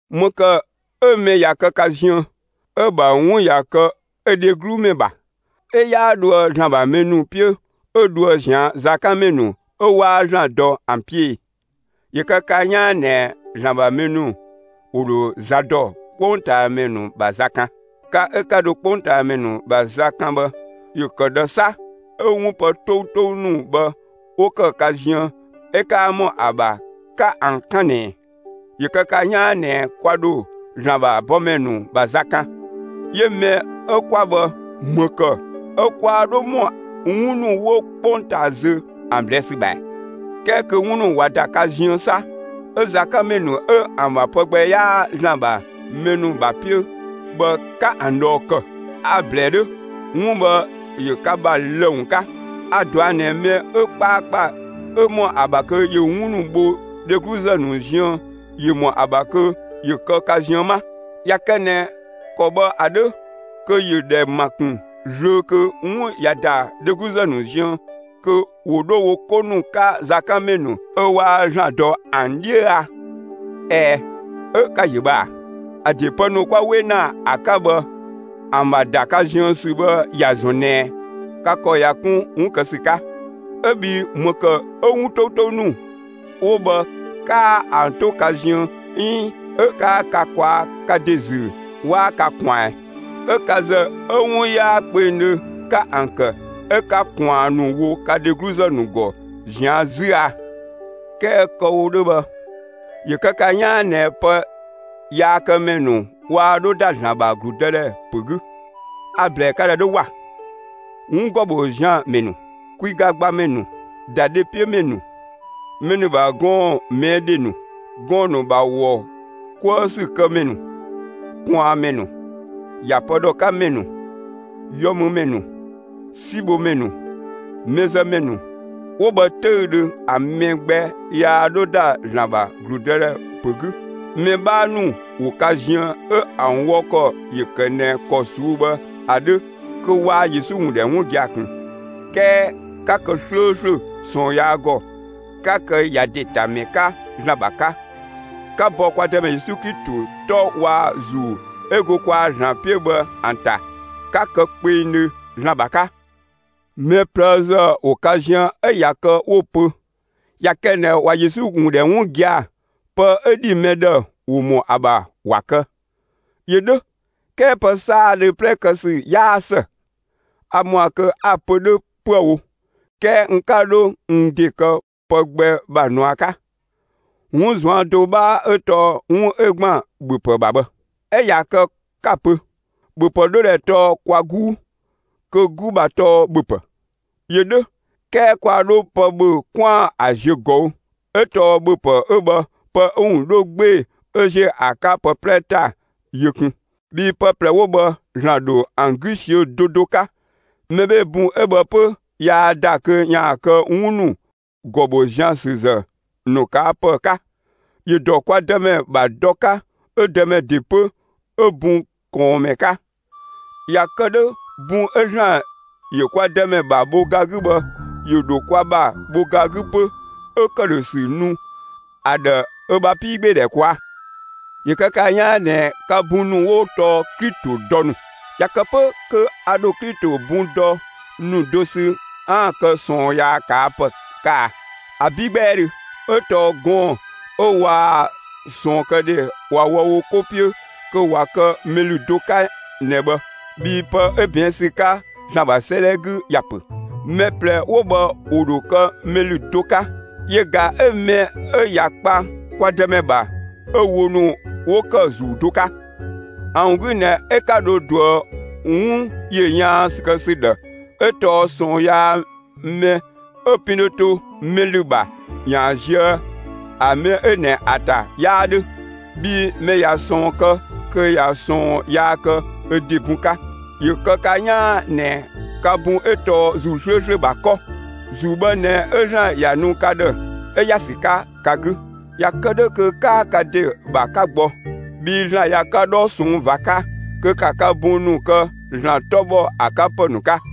‑Më ‑kë 'ö mɛ ꞊ya kë ka ziën, 'ö‑ ‑bha 'wun ꞊ya kë ö dheglumɛ ‑bha, 'ö 'yaa dhoë ‑Zlan ‑bha mɛ ‑nu 'piö, 'ö dhoë ꞊zian' zakanmɛ ‑nu 'ö 'waa ‑Zlan dɔ ‑an 'piö e? ‑Yö kë ka 'yaan ꞊nɛ ‑Zlan ‑bha mɛ ‑nu ‑wo ‑dho za dɔ 'kpongtaamɛ ‑nu ‑bha za kan. Ka 'ö 'ka dho 'kpongtaamɛ ‑nu ‑bha za 'kan bhë, ‑yö ‑kë ꞊dhë 'sa 'ö 'wun pë 'toutou ‑nu bhë 'wo ‑kë ka ziën 'ö 'kaa ‑mɔ ‑a ‑bha 'ka ‑an 'kan ꞊nɛɛ? ‑Yö kë ka 'yaan ꞊nɛ kwa ‑dho ‑Zlan ‑bha bɔmɛ ‑nu ‑bha za kan; 'yö mɛ 'ö 'kwa bhë, ‑më ‑kë 'ö kwaa 'dho ‑mɔ 'wun ‑nu 'wo 'kpongtaa zö ‑an ꞊blɛɛ' ‑sü ‑bha ‑ɛ? 'Kɛɛ kö 'wun ‑nu ꞊wa ‑da ka ziën 'sa, 'ö zakanmɛ ‑nu 'ö ‑an ‑bha pë gbɛ 'yaa ‑Zlan ‑bha mɛ ‑nu ‑bha 'piö bhë 'ka ‑an ꞊dhɔɔ ‑kë! A‑ ‑blɛɛ 'dhö! 'Wun bhë ‑yö ka ‑bha lë‑ ‑wun 'ka. A‑ ꞊dɔa' ꞊nɛ mɛ 'ö 'kpaakpa 'ö ‑mɔ ‑a ‑bha kö ‑yö 'wun ‑nu bho dhegluzë ‑nu ziën ‑yö ‑mɔ ‑a ‑bha kö ‑yö kë ka ziën 'ma. ꞊Ya kë ꞊nɛ ‑kɔ bhë ‑a 'dhö, kö ‑yö ‑dhɛ ‑ma ‑kun zlöö kö 'wun ꞊ya ‑da dhegluzë ‑nu ziën, kö ‑wo 'dho wo 'ko ‑nu 'ka zakanmɛ ‑nu 'ö 'waa ‑Zlan dɔ ‑an 'dhiö a? Ɛɛ, 'ö ka‑ ‑yö bhë ꞊a! ‑A ‑de pë ‑nu 'kwa 'we ‑na ‑an 'ka bhë ‑an ‑bha ‑da ka ziën ‑sü bhë ‑ya ‑zɔn ꞊nɛ ka ‑kɔ ꞊ya 'kun 'wun kë ‑sü 'ka. 'Ö bhii ‑më ‑kë 'ö 'wun 'toutou ‑nu 'wo bhë 'kaa ‑an 'to ka ziën 'iin 'ö 'kaa ka ꞊kwaa' ka ‑de ‑zü 'waa ka ꞊kwaan ꞊ɛn? 'Ö ka ‑zë 'ö 'wun 'yaa kpengdhö 'ka ‑an ‑kë; 'ö 'ka ꞊kwaan ‑nu wo ka dhegluzë ‑nu ‑gɔ ꞊zian' 'zü a! 'Kɛɛ kë‑ wo 'dhö bhë, ‑yö kë ka 'yaan ꞊nɛ pë yaakëmɛ ‑nu waa 'dho ‑da ‑Zlan ‑bha ‑gludëdhɛ ‑pö 'gü. A‑ ‑blɛɛ ka ‑dhë 'dhö ‑wa! 'Wun ‑gɔ ‑bho zian‑ ‑mɛ ‑nu, kwiga gbamɛ ‑nu, ‑dadhepiömɛ ‑nu, mɛ ‑nu ‑bha gɔɔn‑ ꞊mɛɛ' ‑dhe ‑nu, gɔɔn‑ ‑nu ‑bha ‑wɔ 'kuë ‑sü kë ‑mɛ ‑nu, ꞊kwaanmɛ ‑nu, ‑ya pë ‑dhɔ 'ka ‑mɛ ‑nu, yɔmümɛ ‑nu, 'sibhomɛ ‑nu, mɛzëmɛ ‑nu 'wo bhë 'töüdhö, ‑a mɛ gbɛ yaa 'dho ‑da ‑Zlan ‑bha ‑gludëdhɛ ‑pö 'gü. Mɛ 'bhaa ‑nu ‑wo ka ziën 'ö ‑an wɔ ‑kɔ ‑yö ‑kë ꞊nɛ ‑kɔ ꞊suu'‑ bhë ‑a 'dhö kö waa Yesu ‑wun ‑dhɛ 'wun gia‑ ꞊kun. 'Kɛɛ 'ka kë 'slööslö ꞊sɔɔn yaa ‑gɔ; 'ka kë ‑ya ‑de ‑ta ‑mɛ 'ka ‑Zlan ‑bha 'ka; 'ka bɔ kwa Dëmɛ Yesu Klito 'tɔ waa‑ ‑Zuu 'ö go kwaa‑ ‑Zlan 'piö bhë ‑an ‑ta, 'ka kë kpengdhö ‑Zlan ‑bha 'ka. Mɛ ꞊plëëzë ‑wo ka ziën 'ö ꞊ya kë 'wo‑ pö ꞊ya kë ꞊nɛ ꞊wa Yesu ‑wun ‑dhɛ 'wun gia‑, pë 'ö ‑dhi mɛ ‑dhë, ‑wo ‑mɔ ‑a ‑bha ‑wa kë. ‑Yö 'dhö, 'kɛɛ pë 'saadhö 'plɛ kë ‑sü 'yaa ‑së. A ‑mɔa kö 'a‑ pö 'dhö 'püë‑ wo; 'kɛɛ n 'ka 'dho n ‑de kë pë gbɛ ‑bha ꞊nua 'ka. 'Wun ꞊zuan' do 'bhaa 'ö tɔɔ 'wun 'ö ‑gban ‑bhöpë ‑bha bhë; 'ö ꞊ya kë ka‑ ‑pö: «‑Bhöpë 'dhodhɛ tɔɔ kwa 'guu; kö 'gu ‑bha tɔɔ ‑bhöpë.» ‑Yö 'dhö, 'kɛɛ kwaa 'dho pë ‑bhö 'kwaan‑ ‑a ziö ꞊gɔü'; 'ö tɔɔ ‑bhöpë 'ö bhë pë 'ö‑ ‑wun 'dho 'gbee‑ 'ö ‑ziö ‑a 'ka pë 'plɛ ‑ta yö kun; bhii pë ꞊plɛ 'wo bhë ‑Zlan ‑dho ‑an 'gü ꞊siö'‑ do do 'ka. Mɛ 'bhee‑ bun 'ö bhë 'pö yaa ‑da kö ‑yaan kë 'wun ‑nu ‑gɔ ‑bho zian ‑sü ‑zë ‑nu ꞊kaa' ‑pë 'ka. ‑Yö ‑dɔ kwa Dëmɛ ‑bha dɔ 'ka 'ö Dëmɛ ‑de 'pö 'ö bun ꞊kɔɔnmɛ 'ka. ꞊Ya kë 'dhö bun 'ö ‑Zlan ‑yö kwa Dëmɛ ‑bha bho ga 'gü bhë, ‑yö ‑dho kwa ‑bha bho ga 'gü 'pö 'ö ‑këdhösü nu ‑a ‑dhë ö ‑bha 'piigbeedhɛ ꞊kwaa'. ‑Yö kë ka 'yaan ꞊nɛ ka bun ‑nu 'wo tɔɔ Klito dɔ ‑nu. ꞊Ya kë 'pö kö a ‑dho Klito bun dɔ ‑nu do sü 'aan‑ kë ꞊sɔɔn yaa ꞊kaa' ‑pë 'ka a? ‑Abi' 'gbɛɛdhö! 'Ö tɔɔ gɔɔn‑ 'ö waa‑ ꞊sɔɔnkëdhe ꞊wa wɔ wo 'ko 'piö kö ꞊wa kë mɛ ‑lü do 'ka ꞊nɛ bhë bhii pë 'ö ꞊bɛɛn' ‑sü 'ka ‑Zlan ‑bha 'sëëdhɛ 'gü ‑ya ‑pö: Mɛ ꞊plɛ 'wo bhë ‑wo ‑dho kë mɛ ‑lü do 'ka. Yö ꞊ga 'ö mɛ 'ö ꞊ya kpa kwa Dëmɛ ‑bha 'ö wo ‑nu 'wo ‑kë ‑Zuu do 'ka. ‑A ‑wun 'gü ꞊nɛ 'ö 'ka dho ꞊duë 'wun ‑yö yaan ‑sü kë ‑sü ‑dhë 'ö tɔɔ ꞊sɔɔn yaa mɛ 'ö pin dho to mɛ ‑lü ‑bha ‑yaan ziö ‑a mɛ 'ö ꞊nɛ ‑a ‑ta 'yaa 'dhö; bhii mɛ ꞊ya ꞊sɔɔn kë kö ꞊ya ꞊sɔɔn yaa kë ö ‑de bun 'ka. ‑Yö kë ka 'yaan ꞊nɛ ka bun 'ö tɔɔ ‑Zuu 'slööslö ‑bha 'kɔ. ‑Zuu bhë ꞊nɛ 'ö ‑Zlan ‑ya nu ka ‑dhë 'ö ‑ya ‑sü 'ka ka 'gü; ꞊ya kë 'dhö kö 'kaa ka ‑de ‑bha 'ka gbɔ. Bhii ‑Zlan ꞊ya ka 'dhɔ ꞊sɔnng' ꞊va 'ka, kö ‑ka ka bun ‑nu kë ‑Zlan 'tɔ ‑bhɔ ‑a 'ka ‑pë ‑nu 'ka.